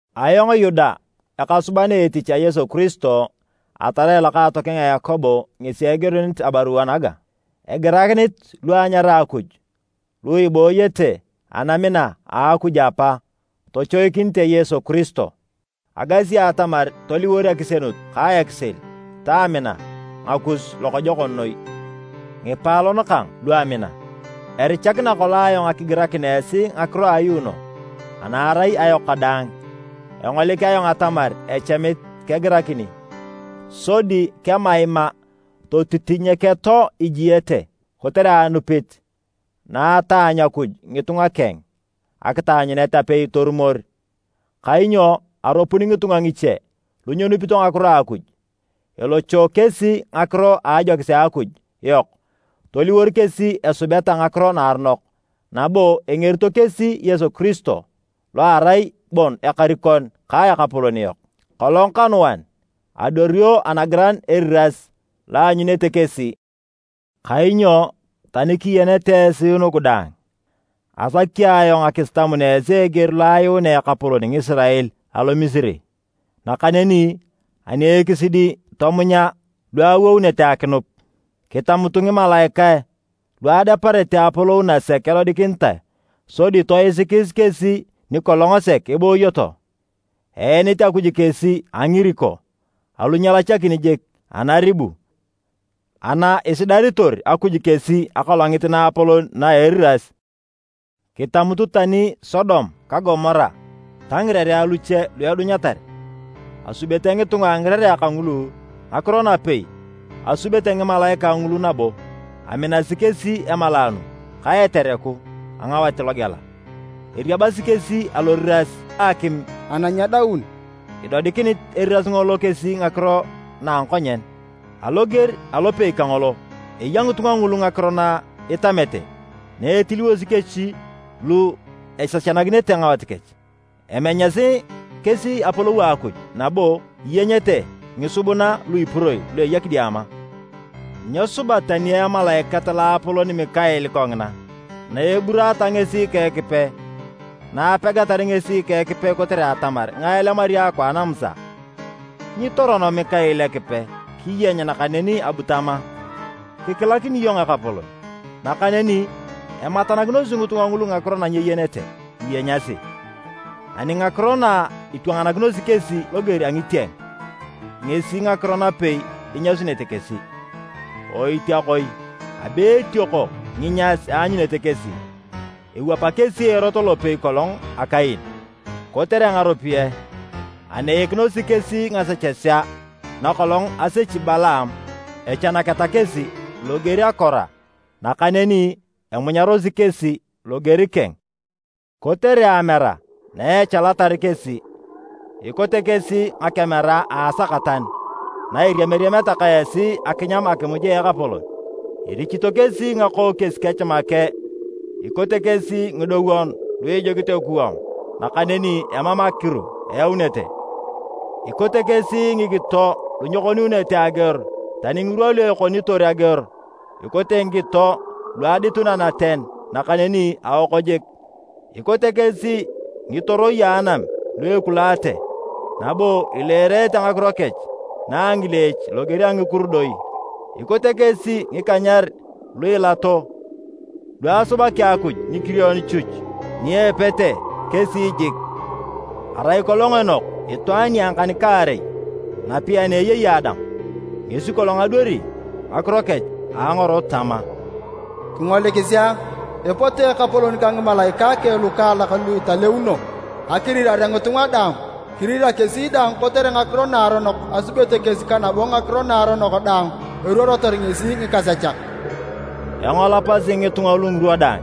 Ayong Yuda ekasuban etich a Yesu Kiristo atarai lokaatokeng a Yakobo ngesi egirunit abarua naga. Egirakinit lu anyara Akuj, lu ibooyete anamina a Akuj Apa tochoikinite Yesu Kiristo. Agasi atamar toliwor akisienut ka ekisil ta amina ngakus lokojokon noi. Ngipaalon kang lu amina, erichakina kolong ayong akigirakin esi ngakiro a ayuuno ana erai ayok kadaang. Engolik ayong atamar echamit kegirakini, sodi kemaima totitinyeketo ijiete kotere anupit na etaanyu Akuj ngitunga keng akitaanyunet apei torumor. Kainyo aropun ngitunga ngiche lu nyenupito ngakiro a Akuj. Elocho kesi ngakiro a ajokis a Akuj yok toliwor kesi esubeta ngakiro naaronok, nabo engerito kesi Yesu Kiristo lo erai bon Ekarikon ka Ekapolon yok. Kolong kanuan, adwario Anagiran eriras, lo eanyunete kesi. Kainyo tani kiyenete esi nugu daang, asaki ayong akisitamun esi eger lo ayuunea Ekapolon Ngisirael alo Misiri, nakaneni ani ekisidi tomunya lu awounete akinup. Kitamutu ngimalaikae lu adeparete apolou nasek edodikinitae sodi toisikis kesi ni kolong sek eboyoto, eenit Akuj kesi a ngiriko alu nyelachakin jik anaribu ana isidaritor Akuj kesi Akolongit Naapolon na a eriras. Kitamutu tani Sodom ka Gomora ta ngirerea luche lu edunyatar, asubete ngitunga a ngirerea kangulu ngakiro napei asubete ngimalaikae ngulu nabo aminasi kesi emalaanu ka etereku a ngawat logela, eriabasi kesi aloriras a akim ana nyedaun idodikinit eriras ngolo kesi ngakiro na a ngakonyen. Aloger alopei kangolo, eya ngitunga ngulu ngakiro na itamete na etiliwosi kesi lu esechanakinete ngawat kech, emenyasi kesi apolou a Akuj nabo iyenyete ngisubuna lu ipuroi lu eya kidiama. Nyesuba tani emalaikat loapolon Mikael kongina. Na eburaata ngesi ka Ekipe, na apegatar ngesi ka Ekipe kotere atamar ngae elemari akwaan a Musa, nyitorono Mikael Ekipe kiyeny nakaneni abu tama, “Kikilakini iyong Ekapolon!” Nakaneni ematanakinosi ngitunga ngulu ngakiro na nyeyenete iyenyasi, ani ngakiro na itwanganakinosi kesi loger a ngitieng, ngesi ngakiro napei inyasunete kesi. Oitiakoi! Abe etioko nginyas eanyunete kesi! Ewapa kesi erot lopei kolong a Kain. Kotere ngaropiyae, aneikinosi kesi ngasechesea na kolong asechi Balaam. Echanaketa kesi loger a Kora, nakaneni amunyarosi kesi loger keng. Kotere amera na echalatar kesi, ikote kesi ngakemera a asakatan na iriamiriameta ka esi akinyam akimuj a Ekapolon. Irichito kesi ngakookies kech make. Ikote kesi ngidowon lu ijukit ekuwam nakaneni emam akiru eyaunete. Ikote kesi ngikito lu nyekoniunete ageor tani ngirwa lu ekonitor ageor, ikote ngikito lu aditun anaten, nakaneni aoko jik. Ikote kesi ngitoroi a anam lu ekulaate, nabo ileerete ngakiro kech na a ngileech loger a ngikurudoi. Ikote kesi ngikanyer lu ilato, lu asubaki Akuj nikirion chuch ni epete kesi jik. Arai kolong Enok itwaan nia ngikan-kaarei napei ani eyei Adam, ngesi kolong adwari ngakiro kech a angorot tama, “Kingolikisi a, epote Ekapolon ka ngimalaikae keng lukaalak lu italeuno akirirare ngitunga daang, kirira kesi daang kotere ngakiro naaronok asubete kesi ka nabo ngakiro naaronok daang eruorotor ngesi ngikasechak!” Engolopasi ngitunga lugu ngirwa daang,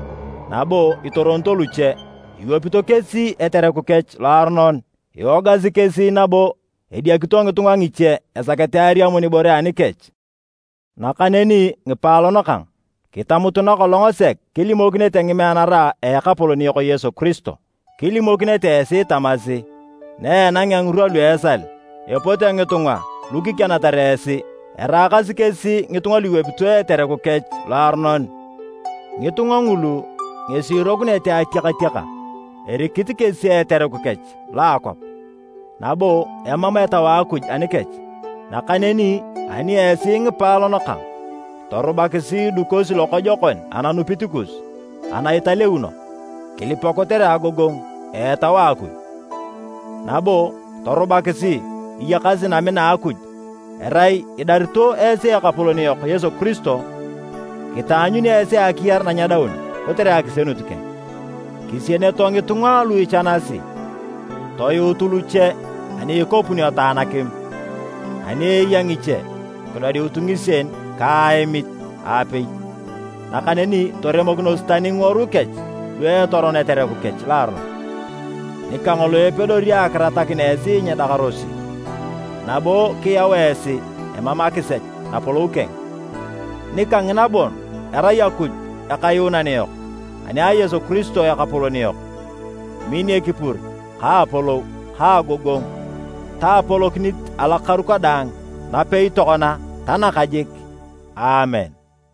nabo itoronito luche, iwapito kesi etereku kech loaronon, iwogasi kesi nabo ediakito ngitunga ngiche esakete ariamun ibore anikech. Nakaneni ngipaalon kang, kitamutu na kolong sek kilimokinete ngimeanara a Ekapolon yok Yesu Kiristo. Kilimokinete esi tamasi, “Na enangea ngirwa lu esal, epote ngitunga lu kikianatar esi, eraakasi kesi ngitunga lu iwapito etereku kech loaronon.” Ngitunga ngulu ngesi irokunete atiakatiaka, erikit kesi etereku kech lo a akwap, nabo emam Etau a Akuj anikech. Nakaneni ani esi ngipaalon kang, torubakisi idukosi lokojokon ananupit kus ana italeuno. Kilipa kotere agogongu a Etau a Akuj, nabo torubakisi iyakasi namina a Akuj, erai idarito esi Ekapolon yok Yesu Kiristo kitaanyuni esi akiyar na nyedaun kotere akisienut keng. Kisieneto ngitunga lu ichanasi, toyuutu luche ani ikopuneto anakim. Ani eya ngiche, kidodiutu ngisien ka aemit aapei. Nakaneni toremokinos tani ngiworui kech lu etoron etereku kech loaronon. Nika ngolo epedori akiratakin esi nyiidakarosi, nabo kiyau esi emam akisech napolou keng, nika ngina bon erai Akuj Akayuunan yok ani a Yesu Kiristo Ekapolon yok, min ekipur ka apolou, ka agogongu ta apolokinit alokaru kadaang, napei tokona ta nakajik! Aamen.